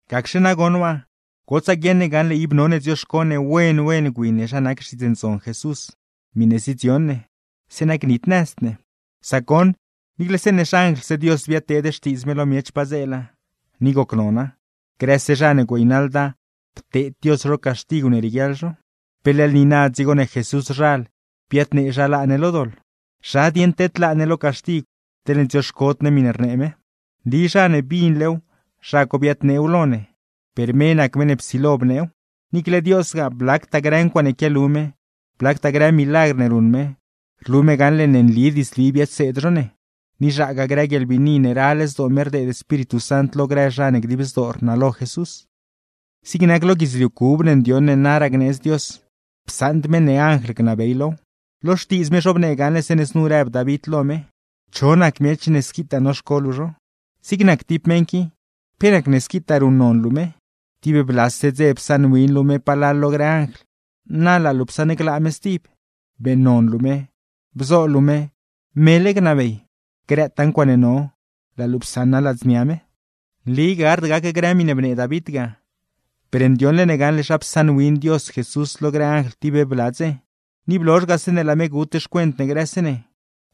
Gacxe nagoṉ waa, gotsaa guieṉ ne gaṉle ib none dzioxco ne wen wen gwi ne zha nac Xtiidz Ndzon Jesús miṉe zidzion ne; zeeṉa gnitnëzd ne. Sac goṉ, niicle zeeṉe xanjlse Dios biadteed xtiidz me lo miech padzeela, ni gocnona; grëse zha ne güeynaḻda, pteed Dios zho caxtigw ne rieguiaḻ zho. ¿Pe leḻgue niina dzigo ne Jesúszhal biadnee zha laa ne lo doḻ? ¿Zha dieṉ tedlaa ne lo caxtigw, teḻne dzioxcod ne miṉe rnee me? Nli zha ne binlew zha co biadneew lo ne, per me nac meṉ ne psilo bneew; niicle Diosgaa, blactaa grë ncuaaṉe quialu me, blactaa grë milagr ne ruṉ me, rlu me gaṉle ne nli diidzli biadseed zho ne; ni zhaagaa grë guieḻbiini ne ral zdoo me rdeed Espíritu Sant lo grë zha ne dib zdoo rnalo Jesús. Zig nac lo guidzliu cub ne ndioṉ ne naraa gneedz Dios, psaṉd me ne anjl gnabey low. Lo Xtiidz me zhobnee gaṉle zeeṉe znu rëb David lo me: ¿Cho nac miech ne squitaa noxco luu zho? Zig nac tib meṉ qui, ¿pe nacne squitaa ruṉnon luu me? Tib blase dze psaṉwin luu me palal lo grë anjl; na laa luu psaṉglaa me stib, beeṉnon luu me, bzo luu me mele gnabey. Grëtaa ncuaaṉe no, laa luu psaṉa ladznia me. Nli gard gac grë miṉe bnee David ga, per ndioṉle ne gaṉle zha psaṉwin Dios Jesús lo grë anjl tib bla dze, ni blozh ga zeeṉe laa me gut xcuent ne grëse ne,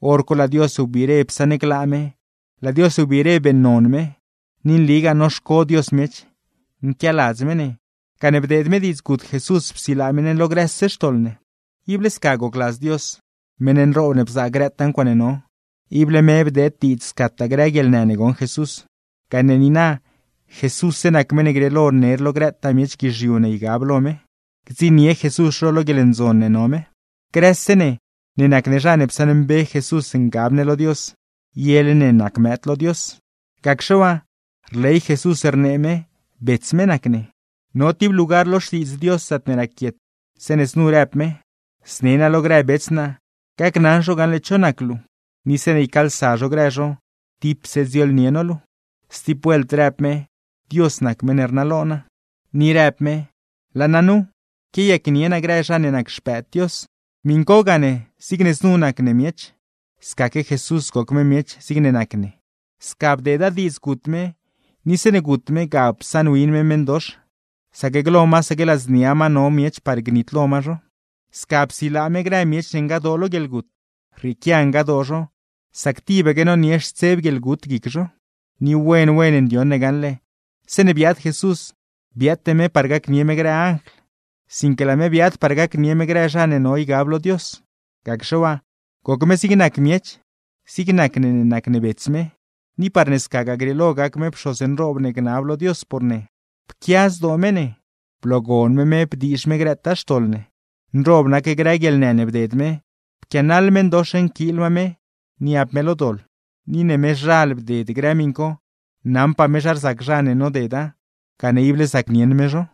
hor co laa Dios biire psaṉglaa me, laa Dios biire beeṉnon me. Ni nligaa noxco Dios miech, nquialadz me ne, gane bdeed me diidz gut Jesús psilaa me ne lo grëse xtoḻ ne. Ible sca gocladz Dios, meṉ nroob ne bzaa grëtaa ncuaaṉe no, ible me bdeed diidz scataa grë guieḻnë ne goṉ Jesús; gane niina, Jesússe nac meṉ ne grieelo ner lo grëtaa miech guizhiu ne no ygab lo me, gdziṉnie Jesús zho lo guieḻndzon ne no me. Grëse ne ne nac ne zha ne psaṉmbe Jesús ngab ne lo Dios, yele ne nac mëëd lo Dios. Gacxe waa, rley Jesús rnee me bets me nac ne; no tib lugar lo Xtiidz Dios zaatne raquiet zeeṉe znu rëb me: Zne naa lo grë bets naa, gacnaṉ zho gaṉle cho nac luu; ni zeeṉe ycaalsa zho grë zho, tipse dziooḻnie no luu. Stib vuelt rëb me: Dios nac meṉ ne rnalo naa. Ni rëb me: Laa naa nu, quiayacnie naa grë zha ne nac xpëëd Dios. Miṉ co gane, zigne znu nac ne miech, scaque Jesús goc me miech zigne nac ne. Sca bdeeda diidz gut me, ni zeeṉe gut me, ga psaṉwin me meṉdox, sac glo masaque ladznia ma no miech par gnitlo ma zho. Sca psilaa me grë miech ne ngadoo lo guieḻgut; rrieequia ngadoo zho, sac tibaque nonie xtseb guieḻgut guic zho. Ni wen wen ndioṉ ne gaṉle, zeeṉe biaad Jesús, biaate me par gacnie me grë anjl, sinque laa me biaad par gacnie me grë zha ne no ygab lo Dios. Gacxe waa, goc me zig nac miech, zigne nac ne ne nac ne bets me; ni parne scagaa grieelo gac me pxoz nroob ne gnab lo Dios por ne. Pquia zdoo me ne, bloogon me me bdiizh me grëtaa xtoḻ ne; nroob nac grë guieḻnë ne bded me, pquianaḻ meṉdox nquiil ma me niab me lo doḻ. Ni ne mezhal bded grë miṉ co, naṉpaa me zha rzac zha ne nodeda, gane ible zacnieṉ me zho.